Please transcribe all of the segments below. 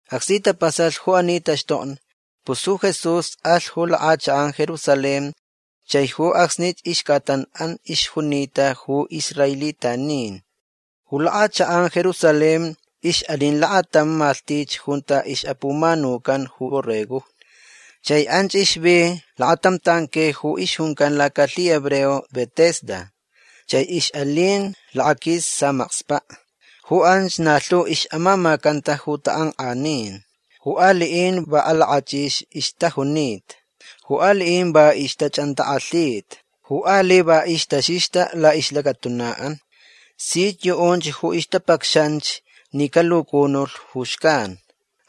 Acsni tapasalh ju ani taxtokni pus ju Jesús alh ju lak'achak'an Jerusalén chai ju acsni ixc'atan'an ixjunita ju israelitanin. Ju lak'achak'an Jerusalén ix'alin lakatam malhtich junta ix'apumanucan ju borregojni. Chai anch ixvi lakatam tanque ju ixjuncan lacalhihebreo Betesda. Chai ix'alin lakaquis samakspa'. Ju anch na lhu ix'amamacanta ju tak'ank'anin. Ju ali'in va alak'ach'ix ixtajunita. Ju ali'in va ixch'antak'alhita. Ju ali' va ixtaxixta la'ixlacatuna'an. Sich yu'unch ju ixtapacxanch ni calucunulh ju xcan.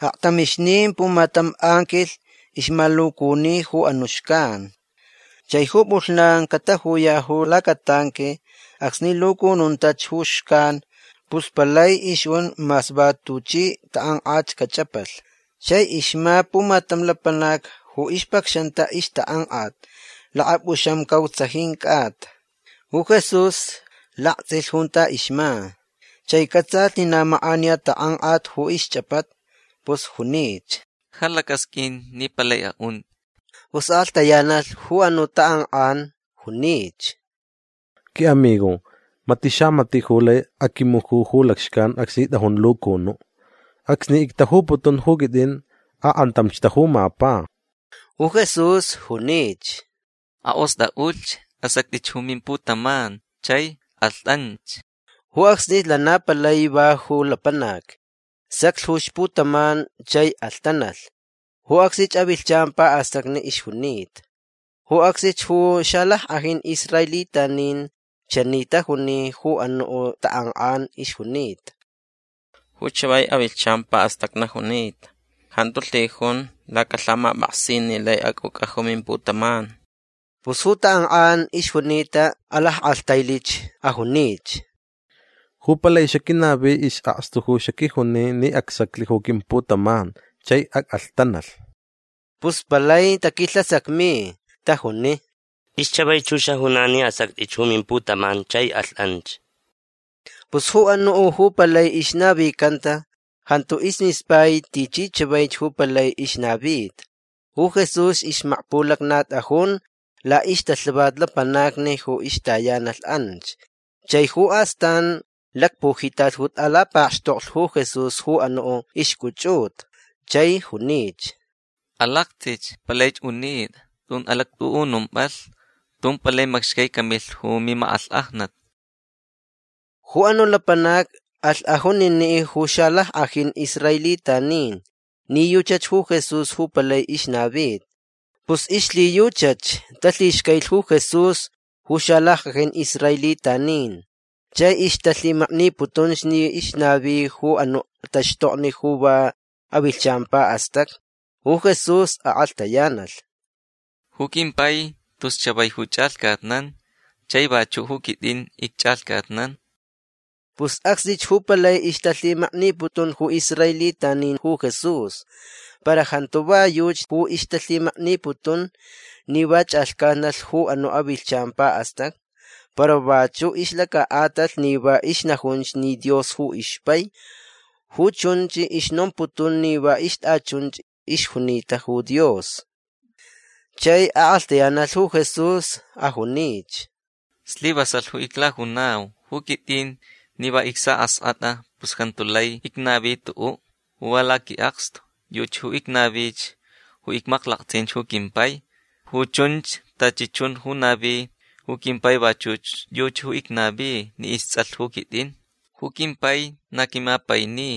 Aktamixnin pumatam anquilh ixmalucuni ju anu' xcan. Chai ju p'ulhnan catajuya' ju lacatanque acsni lucununtach ju xcan pus palai ixjun mas va tuchi tak'ank'at cach'apalh. Chai ixma pumatam lapanac ju ixpacxanta ixtak'ank'at lakap'uxamcautsajin c'ata. Ju Jesús lakts'ilh junta ixma. Chai c'atsalh ni na mak'aniya tak'ank'at ju ixch'apata. Pus junich: ―Ja lac'asq'uin ni palai a'unt'i. Pus ak'alhtayanalh ju anu' tak'ank'an. Junich: ―Qui'amigo mati' xamati' ju lai aquimuju ju lacxcan acsni t'ajun lucunu'. Acsni ictajuputun ju quit'in ak'antamch tajumapa. Ju Jesús junich: ―Ak'ost'a'ulhch. Asact'ich ju mimputaman chai alht'anch. Ju acsnich lana palai va ju lapanac. Saclh ju ixputaman chai alhtanalh. Ju acsnich avilhchan pa'astacni ixjunita. Ju acsnich ju xalack'ajin israelitanin chani tajuni ju anu' tak'ank'an ixjunita: ―Ju chavai avilhchan pa'astacni junita. Jantu lhijun lacalhamap'aksin ni lai ac'uc'a ju mimputaman. Pus ju tak'ank'an ixjunita alack'alhtailich. Ajunich: ―Ju palai xaquinavi is'akstu ju xaquijuni ni acsaclh ju quimputaman chai ac'alhtanalh. Pus palai taquilhasacmi. Tajuni: ―Tis chavaich ju xajunan ni asact'ich ju mimputaman chai alht'anch. Pus ju anu' ju palai ixnavicanta jantu ismispai tichi chavaich ju palai ixnavita. Ju Jesús ixmakpulacnat'ajun la'ixtalhavat lapanacni ju ixtayanalh anch. Chai ju astan lacpujitat ju t'alapakxtoklh ju Jesús ju anu' ixc'uch'uta. Chai junich: ―Alakts'ich. Palaich unit'a. Tun alact'u'unump'alh. Tun palai macxcai camilh ju mimak'alhk'ajnat. Ju anu' lapanac alh ajunini' ju xalack'ajin israelitanin ni yuchach ju Jesús ju palai ixnavita. Pus ixlhiyuchach talhixcailich ju Jesús ju xalack'ajin israelitanin. Chai ixtalhimakniputunch ni ixnavich ju ani taxtokni ju va avilhchan pa'astacni. Ju Jesús ak'alhtayanalh: ―Ju quimpai tus chavai ju ch'alhcatnan. Chai vachu' ju quit'in icch'alhcatnan. Pus acsnich ju palai ixtalhimakniputun ju israelitanin ju Jesús. Para jantu va yuchi ju ixtalhimakniputun ni va ch'alhcatnalh ju anu' avilhchan pa'astacni para vachu' ixlaca'atalh ni va ixnajunch ni Dios ju ixpai. Ju chunch ixnomputun ni va ixt'achunchach ixjunita ju Dios. Chai ak'alhtayanalh ju Jesús. Ajunich: ―Slivasalh ju iclajunau. Ju quit'in ni va icsa'ask'at'a pus jantu lai icnavi tu'u' ju va laqui'akstu. Yuchi ju icnavich ju icmaklakts'inch ju quimpai. Ju chunch tachi chun ju navi ju quimpai vachuch yuchi ju icnavi ni ists'alh ju quit'in. Ju quimpai na quimapaini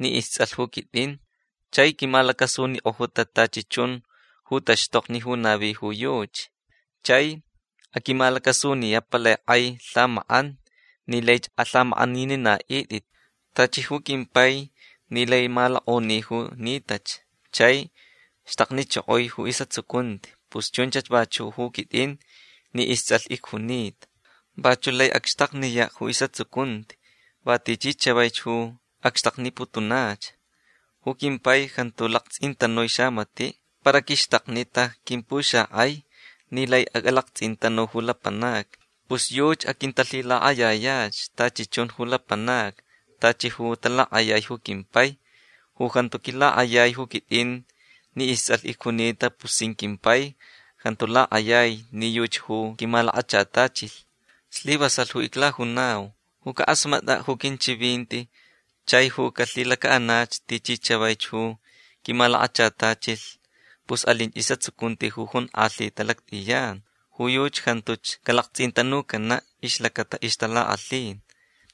ni ists'alh ju quit'in. Chai quimalacasunik'ojuta tachi chun ju taxtokni ju navi ju yuchi. Chai aquimalacasuniya' palai k'ai lhamak'an ni laich alhamak'aninina'it'it. Tachi ju quimpai ni lai malok'oni ju nitach chai xtaknichokoi ju is'atsucunti pus chunchach vachu' ju quit'in ni ists'alh icjunita. Vachu' lai acxtakniya' ju is'atsucunti va tichi chavaich ju acxtakniputunach. Ju quimpai jantu lakts'intanui xamati'. Para quixtaknita quimpuxak'ai ni lai ac'alakts'intanu ju lapanacni. Pus yuchi aquintalhilak'ayayach tachi chun ju lapanacni tachi ju talak'ayaich ju quimpai. Ju jantu quilak'ayai ju quit'in ni ists'alh icjunita pus sin quimpai jantu lak'ayai ni yuchi ju quimalakachatachilh. Slivasalh ju iclajunau. Ju cak'asmat'a' ju quinchivinti chai ju calhilaca'anach tichi chavaich ju quimalakachatachilh pus alinch is'atsucunti jonk'alhita lact'iyan. Ju yuchi jantuch calakts'intanucana' ixlacata ixtalak'alhin.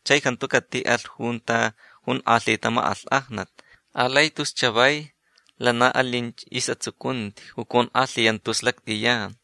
Chai jantu cati'alh junta jonk'alhita mak'alhk'ajnat. Alai tus chavai lana alinch is'atsucunti ju conk'alhiyanta tus lact'iyan.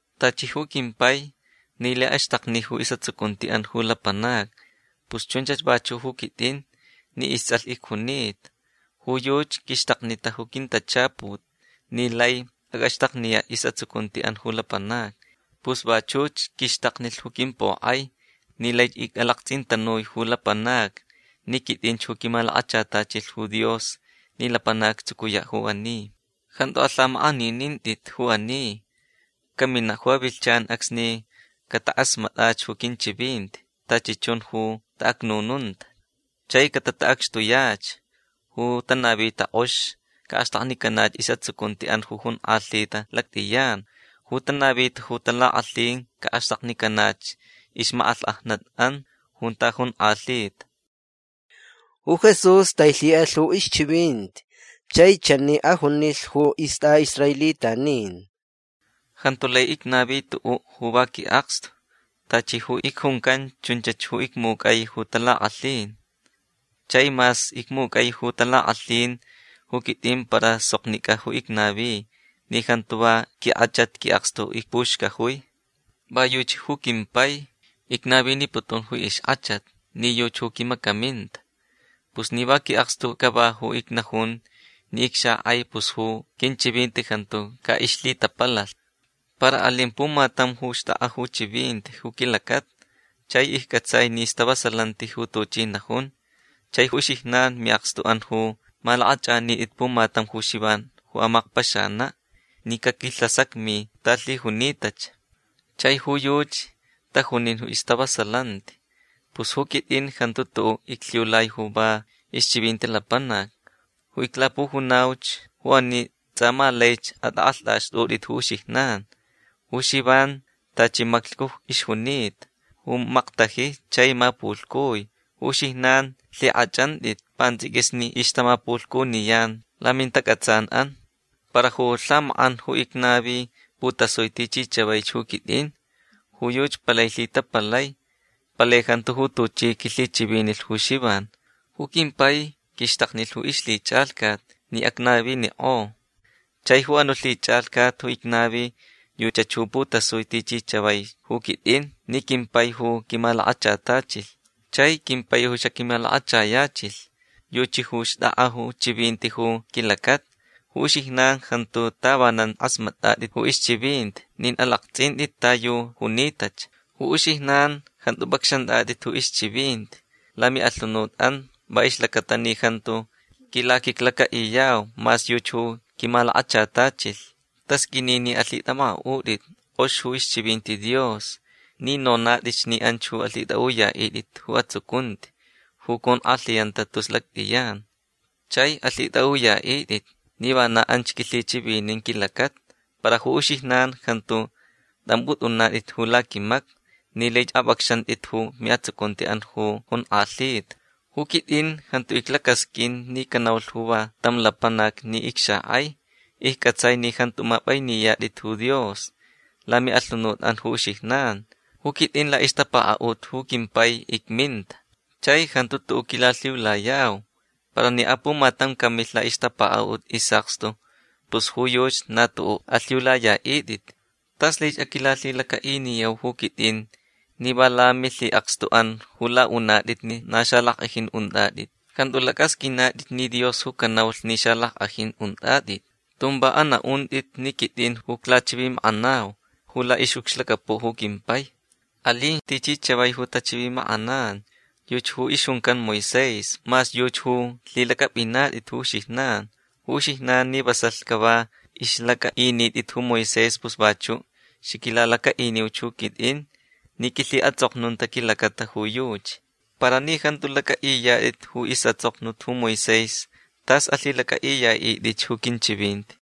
Tachi ju quimpai ni lai axtakni ju is'atsucunti'an ju lapanacni pus chunchach vachu' ju quit'in ni ists'alh icjunita. Ju yuchi quixtaknita ju quintachaput ni lai ac'axtakniya' is'atsucunti'an ju lapanacni. Pus vachuch quixtaknilh ju quimpok'ai ni laich ic'alakts'intanui ju lapanacni ni quit'inch ju quimalakachatachilh ju Dios ni lapanac actsucuya' ju ani. Jantu alhamak'aninint'it ju ani. Camina' ju avilhchan acsni catak'asmat'ach ju quinchivinti tachi chun ju ta'acnununta. Chai catata'acxtuyach. Ju tanavita k'ox ca'axtaknicanach is'atsucunti'an jonk'alhita lact'iyan. Ju tanavita ju talak'alhin ca'axtaknicanach ixmak'alhk'ajnat'an junta jonk'alhita. Ju Jesús tailhi'alh ju ixchivinti chai chani ajunilh ju ist'a'israelitanin: ―Jantu lai icnavi tu'u' ju va qui'akstu. Tachi ju icjuncanch chunchach ju icmuc'ai ju talak'alhin. Chai mas icmuc'ai ju talak'alhin ju quit'in para soknic'a ju icnavi ni jantu va quink'achat qui'akstu icpuxcajui. Va yuchi ju quimpai icnaviniputun ju ixk'achat ni yuchi ju quimacaminta. Pus ni va qui'akstu cava ju icnajun ni icxak'ai pus ju quinchivinti jantu ca'ixlhitapalalh. Para alin pumatam ju xt'ak'a ju chivinti ju quilacata. Chai icc'atsai ni stavasalanti ju tuchi najun. Chai uxijnan mi'akstu'an ju malak'ach'anit'it pumatam ju Xivan ju amakpaxana' ni caquilhasacmi ta lhijunitach. Chai ju yuchi tajunin ju istavasalanti. Pus ju quit'in jantu tu'u' iclhiulai ju va ixchivinti lapanac. Ju iclapujunauch ju ani ts'a ma laich at'ak'alht'axt'ut'it ju uxijnan. Ju Xivan tachi maclhcu ixjunita ju maktaji chai mapulhcui. Ju uxijnan lhik'ach'ant'it pants'iquis ni ixtamapulhcuniyan lamintac'atsan'an. Para ju lhamak'an ju icnavi putasui tichi chavaich ju quit'in. Ju yuchi palai lhitapalai. Palai jantu ju tuchi quilhichivinilh ju Xivan. Ju quimpai quixtaknilh ju ixlhich'alhcat ni acnavinik'o. Chai ju anu' lhich'alhcat ju icnavi yuchach ju putasui tichi chavaich ju quit'in ni quimpai ju quimalakachatachilh. Chai quimpai ju xaquimalakachayachilh yuchi ju xtakta ju chivinti ju quilacata. Ju uxijnan jantu tavanan k'asmat'at'it ju ixchivinti nin alakts'int'it ta yu junitach. Ju uxijnan jantu p'acxant'at'it ju ixchivinti lami'alhunut'an va ixlacata ni jantu quilaquiclaca'iyau mas yuchi ju quimalakachatachilh. Tasq'uini ni alhit'amak'a'ut'it k'ox ju ixchivinti Dios ni nonat'itch ni anch ju alhit'a'uya'it'it ju atsucunti ju conk'alhiyanta tus lact'iyan. Chai alhit'a'uya'it'it ni vana anch quilhichivinin quilacata. Para ju uxijnan jantu t'amp'ut'unat'it ju laquimacni ni laich ap'acxant'it ju mi'atsucunti'an ju jonk'alhita. Ju quit'in jantu iclacasq'uin ni canaulh ju va tam lapanac ni icxak'ai. Icc'atsai ni jantu map'ainiyat'it ju Dios lami'alhunut'an ju uxijnan. Ju quit'in la'ixtapaka'ut ju quimpai icminta. Chai jantu tu'u' quilalhiulayau. Para ni apumatam camilh la'ixtapaka'ut is'akstu pus ju yuchi na tu'u' alhiulaya'it'it. Tas laich aquilalhilaca'iniyau ju quit'in ni va lamilhi'akstu'an ju la'unat'it ni na xalack'ajin unt'at'it. Jantu lac'asq'uinat'it ni Dios ju canaulh ni xalack'ajin unt'at'it. Tun va ana'unt'it ni quit'in ju iclachivimak'anau ju la'ix'ucxlacapu' ju quimpai. Alin tichi chavaich ju tachivimak'anan. Yuchi ju ixjuncan Moisés mas yuchi ju lhilac'ap'inat'it ju uxijnan. Ju uxijnan ni vasalh cava ixlac'a'init'it ju Moisés pus vachu' xaquilalaca'iniuch ju quit'in ni quilhi'ats'oknunta quilacata ju yuchi. Para ni jantu lac'a'iyat'it ju is'ats'oknut ju Moisés tas alhilac'a'iya'it'itch ju quinchivinti.